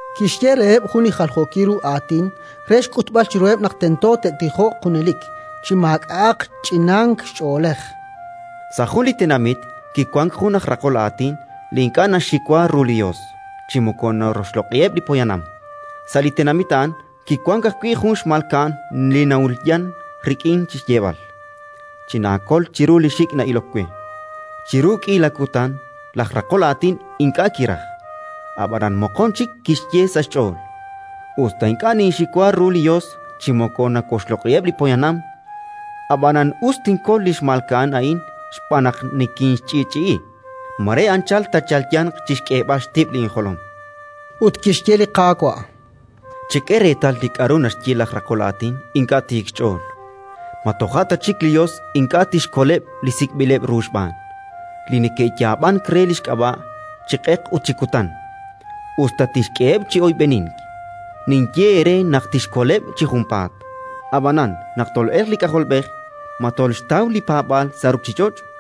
Kixye reheb' jun li jaljookil ru aatin re xk'utb'al chiruheb' naq tento te'tijoq junelik, chi maak'a'aq ch'inank ch'oolej: “Sa' jun li tenamit kiwank jun aj raqol aatin li ink'a' naxxiwa ru li Yos chi moko naroxloq'iheb' li poyanam. Sa' li tenamit a'an kiwank ajwi' jun xmalka'an li na'ulyan rik'in chi xyeeb'al: «Chinaakol chiru li xik' na'ilok we». Chiru k'iila kutan laj raqol aatin ink'a' kiraj, ab'anan moqon chik kixye sa' xch'ool: «Us ta ink'a' ninxiwa ru li Yos chi moko nawoxloq'iheb' li poyanam, ab'anan us tinkol li xmalka'an a'in xb'aan naq nikinxch'i'ch'i'i. Mare anchal taachalyanq chi xk'eeb'al xtib'l injolom»”. Ut kixye li Qaawa': “Chek'e reetal li k'aru naxye laj raqol aatin ink'a' tiik xch'ool. Ma toja' ta chik li Yos ink'a' tixkoleb' li sik'b'ileb' ru xb'aan, li neke'yaab'ank re li xk'ab'a' chi q'eq ut chi kutan, us ta tixk'eheb' chi oyb'enink? Ninye eere naq tixkoleb' chi junpaat. Ab'anan, naq tol'elq li K'ajolb'ej, ma tolxtaw li paab'aal sa' ruuchich'och'?”.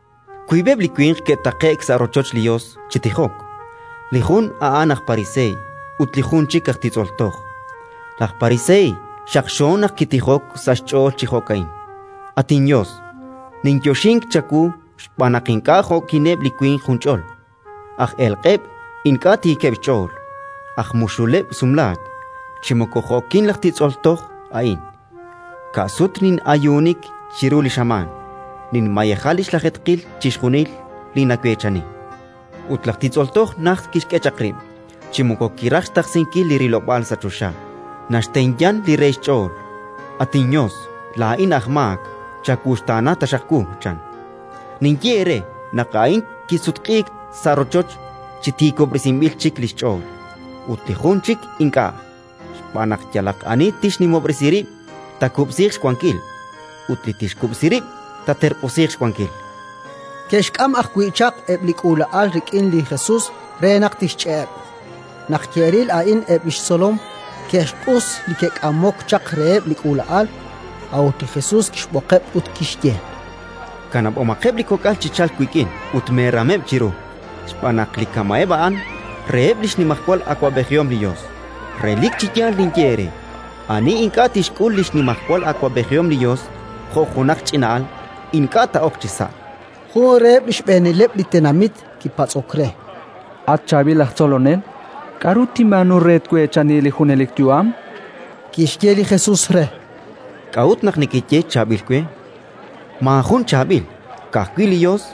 “Wiib'eb' li winq ke'taqe'k sa' rochoch li Yos chi tijok; li jun a'an aj pariseey ut li jun chik aj titz'ol toj. Laj pariseey, xaqxo naq kitijok sa' xch'ool chi jo'ka'in: «At inYos, ninyoxink chawu xb'aan naq ink'a' jo'kineb' li winq junch'ol, aj elq'eb', ink'a' tiikeb' xch'ool, aj muxuleb' sumlaak, chi moko jo'kin laj titz'ol toj a'in. Ka' sut nin'ayuunik chiru li xamaan, ninmayeja li xlajeetqil chixjunil li naweechani». “Ut laj titz'ol toj najt kixk'e chaq rib'; chi moko kiraj xtaqsinkil li rilob'aal sa' choxa, naxtenyan li re xch'ool: «At inYos, laa'in aj maak. Chawuxtaana taxaq wu!», chan. “Ninye eere naq a'in kisutq'iik sa' rochoch chi tiikob'resinb'il chik li xch'ool, ut li jun chik ink'a'. Xb'aan naq yalaq ani tixnimob'resi rib', taakub'siiq xwankil; ut li tixkub'si rib', taaterq'usiiq xwankil”. Ke'xk'am ajwi' chaq eb' li k'uula'al rik'in li Jesus re naq tixch'e'eb'. Naq ke'ril a'in eb' li xtzolom, ke'xq'us li ke'k'amok chaq reheb' li k'uula'al. A'ut li Jesus kixb'oqeb' ut kixye: —Kanab'omaqeb' li kok'al chi chalk wik'in ut meeram chiruheb', xb'aan naq li kama'eb' a'an, reheb' li xnimajwal awab'ejihom li Yos. Relik chi yaal ninye eere: ani ink'a' tixk'ul li xnimajwal awab'ejihom li Yos jo' junaq ch'ina'al, ink'a' taa'ok chisa'. Jun reheb' li xb'eenileb' li tenamit kipatz'ok re: —At chaab'il aj Tzolonel, k'aru tinb'aanu re tweechani li junelik yu'am? Kixye li Jesus re: —K'a'ut naq nakaye chaab'il we? Maajun chaab'il, ka'ajwi' li Yos.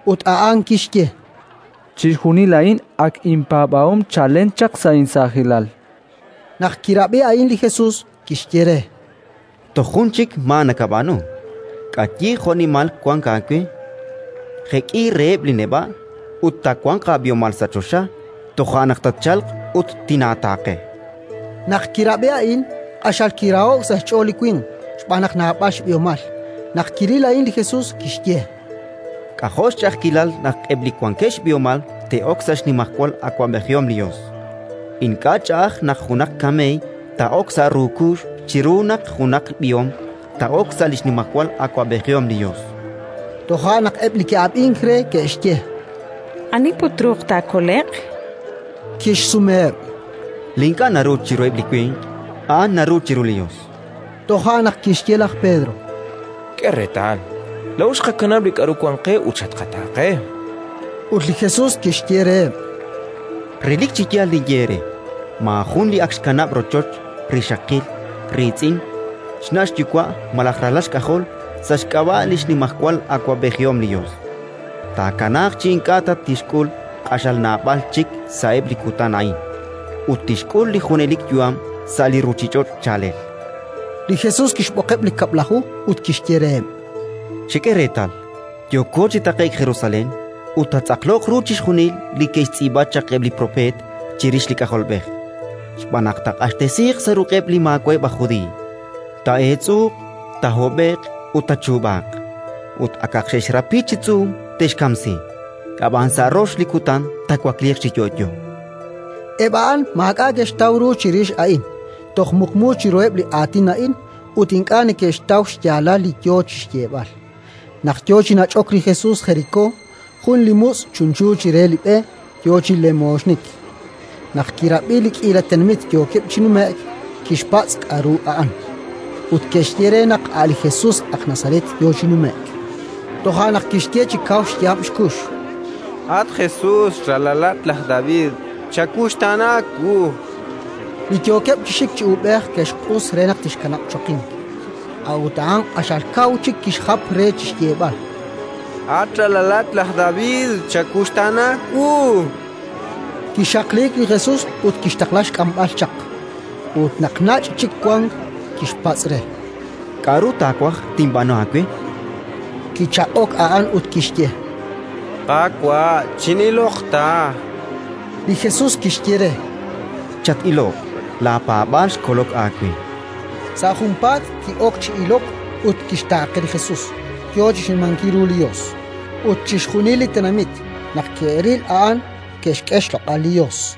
Ut a'an kixye: —Chixjunil a'in ak inpaab'ahom chalen chaq sa' insaajilal. Naq kirab'i a'in li Jesus, kixye re: —Toj jun chik maa nakab'aanu: k'ayi jo'nimal wank aawe, jek'i reheb' li neb'a', ut taawanq aab'ihomal sa' choxa; toja' naq tatchalq ut tinaataaqe. Naq kirab'i a'in, q'axal kiraho'k sa' xch'ool li winq, xb'aan naq naab'al xb'ihomal. Naq kiril a'in li Jesus, kixye: —K'ajo' xch'a'ajkilal naq eb' li wankeb' xb'ihomal te'ok sa' li xnimajwal awab'ejihom li Yos! Ink'a' ch'a'aj naq junaq kameey taa'ok sa' ru kuux chiru naq junaq b'ihom taa'ok sa' li xnimajwal awab'ejihom li Yos. Toja' naq eb' li ke'ab'ink re ke'xye: —Ani put truuq taakole'q? Kixsumeheb': —Li ink'a' naru chiruheb' li winq, a'an naru chiru li Yos, chan. Toja' naq kixye laj Pedro: —K'e reetal, laa'o xqakanab' li k'aru wank qe ut xatqataaqe. Ut li Jesus kixye reheb': —Relik chi yaal ninye eere: maajun li ak xkanab' rochoch, rixaqil, riitz'in, xna' xyuwa' malaj ralal xk'ajol sa' xk'ab'a' li xnimajwal awab'ejihom li Yos, taakanaaq chi ink'a' ta tixk'ul q'axal naab'al chik sa'eb' li kutan a'in, ut tixk'ul li junelik yu'am sa' li ruuchich'och' chaalel. Li Jesus kixb'oqeb' li Kab'laju ut kixye reheb': “Chek'e reetal, yooko chi taqe'k Jerusalén ut taatz'aqloq ru chixjunil li ke'xtz'iib'a chaq eb' li propeet chirix li K'ajolb'ej. Xb'aan naq taaq'axtesiiq sa' ruq'eb' li maawa'eb' aj Judiiy; taa'eetz'uuq, taahob'e'q ut taachuub'aaq, ut, akaq xe'xrapi chi tz'uum, te'xkamsi. Ab'an sa' rox li kutan taawakliiq chi yo'yo”. Eb' a'an maak'a' ke'xtaw ru chirix a'in; toj muqmu chiruheb' li aatin a'in, ut ink'a' neke'xtaw xyaalal li yo chi xyeeb'al. Naq yo chi nach'ok li Jesus Jerikó, jun li mutz' chunchu chire li b'e, yo chi lemooxnik. Naq kirab'i li k'iila tenamit yookeb' chi nume'k, kixpatz' k'aru a'an. Ut ke'xye re naq a' li Jesus aj Nazaret yo chi nume'k. Toja' naq kixye chi kaw xyaab' xkux: —At Jesus, ralalat laj David, chawuxtaana wu! Li yookeb' chi xik chi uub'ej ke'xq'us re naq tixkanab' choqink; a'ut a'an q'axal kaw chik kixjap re chi xyeeb'al: —At ralal laj David, chawuxtaana wu! Kixaqliik li Jesus ut kixtaqla xk'amb'al chaq. Ut naq nach' chik wank, kixpatz' re: —K'aru taawaj tinb'aanu aawe? chan. Kichaq'ok a'an ut kixye: —Qaawa', chin'iloq ta. Li Jesus kixye re: —Chat-iloq! Laapaab'aal xkolok aawe. Sa' junpaat ki'ok chi ilok ut kixtaaqe li Jesus, yo chi xnimankil ru li Yos. Ut chixjunil li tenamit, naq ke'ril a'an, ke'xk'e xloq'al li Yos.